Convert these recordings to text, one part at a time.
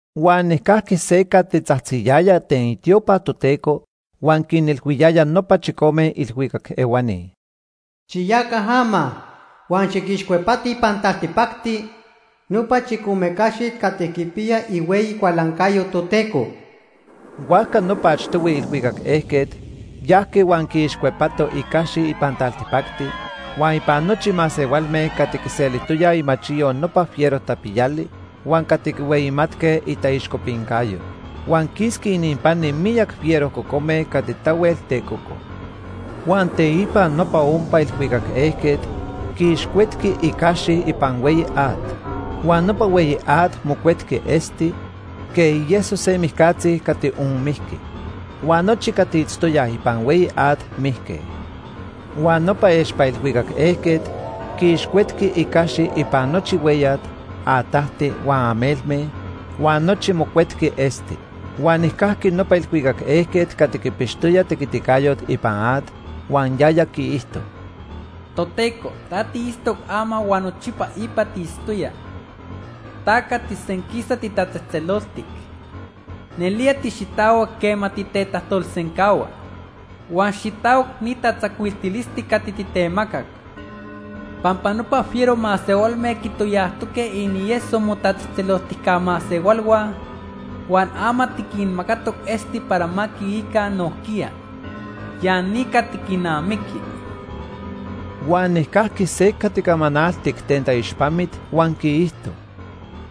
Huan nijcajqui se cati tzajtziyaya ten itiopa Toteco huan quinilhuiyaya nopa chicome ilhuicac ehuani: “Xiyaca ama huan xiquixcuepatij ipan taltipacti nopa chicome caxit cati quipiyaj ihueyi cualancayo Toteco.” Huajca nopa achtohui ilhuicac ejquet yajqui huan quiixcuepato icaxi ipan taltipacti, huan ipan nochi masehualme cati quiselijtoyaj imachiyo nopa fiero tapiyali huan cati quihueyimatque itaixcopincayo. Huan quisqui ininpani miyac fiero cocome cati tahuel tecoco. Huan teipa nopa ompa ilhuicac ejquet quiixcuetqui icaxi ipan hueyi at. Huan nopa hueyi at mocuetqui esti, quej ieso se mijcatzi cati onmijqui. Huan nochi cati itztoyaj ipan hueyi at mijque. Huan nopa expa ilhuicac ejquet quiixcuetqui icaxi ipan nochi hueyat, atajti huan amelme, huan nochi mocuetqui esti. Huan nijcajqui nopa ilhuicac ejquet cati quipixtoya tequiticayot ipan at, huan yaya quiijto: “Toteco, ta tiitztoc ama huan nochipa ipa tiitztoya. Ta cati senquisa titatzejtzeloltic. Nelía tixitahuac quema titetajtolsencahua. Huan xitahuac ni tatzacuiltilisti cati titemacac. Pampa nopa fiero masehualme quitoyajtoque inieso motatzejtzeloltijca masehualhua, huan ama tiquinmacatoc esti para ma quiica nojquiya. Ya ni cati quinamiqui.” Huan nijcajqui se cati camanaltic ten taixpamit huan quiijto: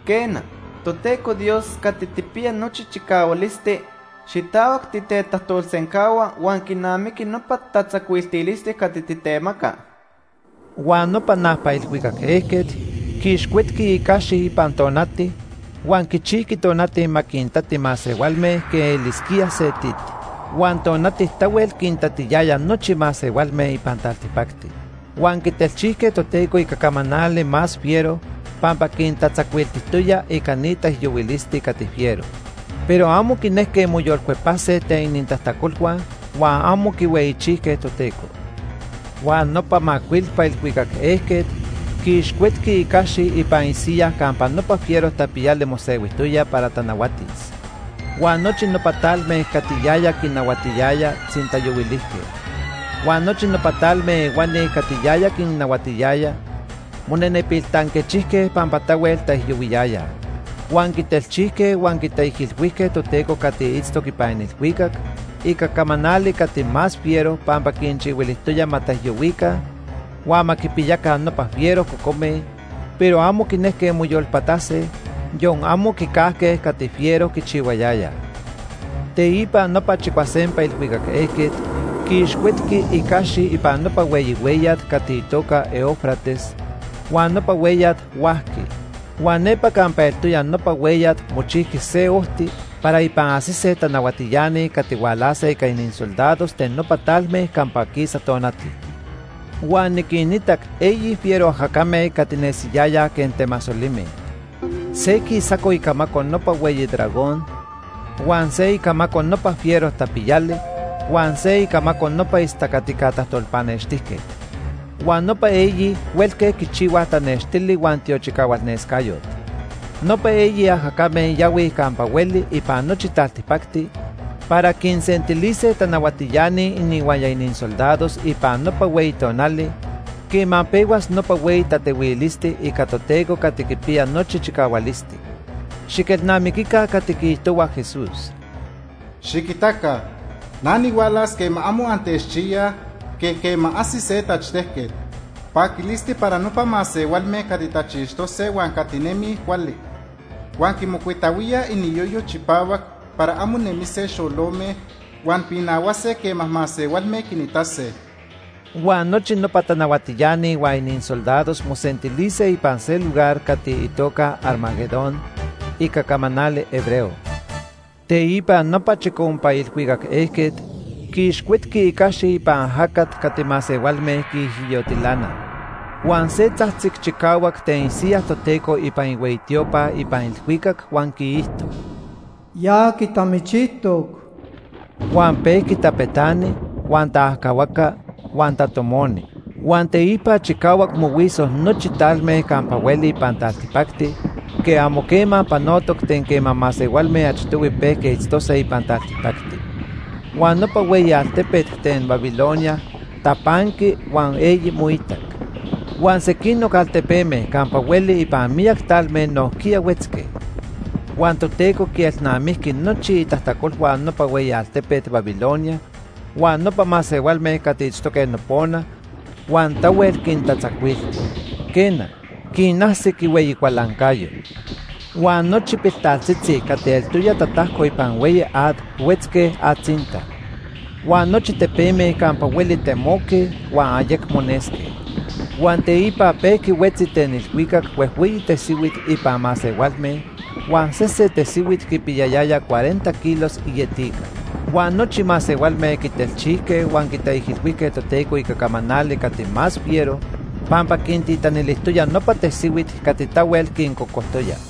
“Quena, Toteco Dios Cati Tijpiya Nochi Chicahualisti, xitahuac titetajtolsencahua huan quinamiqui nopa tatzacuiltilisti cati titemaca.” Huan nopa najpa ilhuicac ejquet quiixcuetqui icaxi ipan tonati huan quichijqui tonati ma quintati masehualme quej elisquía se tit. Huan tonati tahuel quintatiyaya nochi masehualme ipan taltipacti. Huan quitelchijque Toteco ica camanali más fiero pampa quintatzacuiltijtoya ica ni taijyohuilisti cati fiero. Pero amo quinejque moyolcuepase ten inintajtacolhua huan amo quihueyichijque Toteco. Huan nopa macuilpa ilhuicac ejquet quiixcuetqui icaxi ipan isiyaj campa nopa fiero tapiyali mosehuijtoya para tanahuatis. Huan nochi nopa talme cati yaya quinahuatiyaya tzintayohuilijque. Huan nochi nopa talme ehuani cati yaya quinnahuatiyaya monenepil tanquechijque pampa tahuel taijyohuiyayaj. Huan quitelchijque huan quitaijilhuijque Toteco cati itztoc ipan ilhuicac ica camanali cati más fiero pampa quinchihuilijtoya ma taijyohuica huan ma quipiyaca nopa fiero cocome, pero amo quinejque moyolpatase, yon amo quicajque cati fiero quichihuayayaj. Teipa nopa chicuasempa ilhuicac ejquet quiixcuetqui icaxi ipan nopa hueyi hueyat cati itoca Éufrates, huan nopa hueyat huajqui. Huan nepa campa eltoya nopa hueyat mochijqui se ojti para ipan ajsise tanahuatiani cati hualase ica inisoldados ten nopa talme campa quisa tonati. Huan niquinitac eyi fiero ajacame cati nesiyayaj quej temasolime. Se quisaco icamaco nopa hueyi dragón, huan se icamaco nopa fiero tapiyali, huan se icamaco nopa istacatica tajtolpanextijquet. Huan nopa eyi huelque quichihuaj tanextili huan tiochicahualnescayot. Nopa eyi ajacame yahuij campa hueli ipan nochi taltipacti para quinsentilise tanahuatiani inihuaya inisoldados ipan nopa hueyi tonali quema pehuas nopa hueyi tatehuilisti ica Toteco Cati Quipiya Nochi Chicahualisti. Xiquelnamiquica cati quiijtohua Jesús: “Xiquitaca na nihualas quema amo antechchiyaj quej quema ajsi se tachtejquet. Paquilisti para nopa masehualme cati tachixtose huan cati nemij cuali, huan quimocuitahuíaj iniyoyo chipahuac para amo nemise xolome, huan pinahuase quema masehualme quinitase.” Huan nochi nopa tanahuatiani huan inisoldados mosentilise ipan se lugar cati itoca Armagedón ica camanali hebreo. Teipa nopa chicompa ilhuicac ejquet quiixcuetqui icaxi ipan ajacat cati masehualme quiijyotilanaj. Huan se tzajtzic chicahuac ten isiyaj Toteco ipan ihueyi tiopa ipan ilhuicac huan quiijto: “Ya quitamichijtoc.” Huan pejqui tapetani, huan taajcahuaca, huan tatomoni. Huan teipa chicahuac mohuiso nochi talme campa hueli ipan taltipacti quej amo quema panotoc ten quema masehualme achtohui pejque itztose ipan taltipacti. Huan nopa hueyi altepet ten Babilonia tapanqui huan eyi moitac. Huan sequinoc altepeme campa hueli ipan miyac talme nojquiya huetzque. Huan Toteco quielnamijqui nochi itajtacolhua nopa hueyi altepet Babilonia huan nopa masehualme cati itztoque nopona, huan tahuel quintatzacuilti. Quena, quinajsic ihueyi cualancayo. Huan nochi piltaltzitzi cati eltoya tatajco ipan hueyi at huetzque atzinta. Huan nochi tepeme campa hueli temoque huan ayecmo nesque. Huan teipa pejqui huetzi ten ilhuicac huejhueyi tesihuit ipan masehualme huan sesen tesihuit quipiyayaya cuarenta kilos ietica. Huan nochi masehualme quitelchijque huan quitaijilhuijque Toteco ica camanali cati más fiero pampa quintitanilijtoya nopa tesihuit cati tahuel quincocojtoya.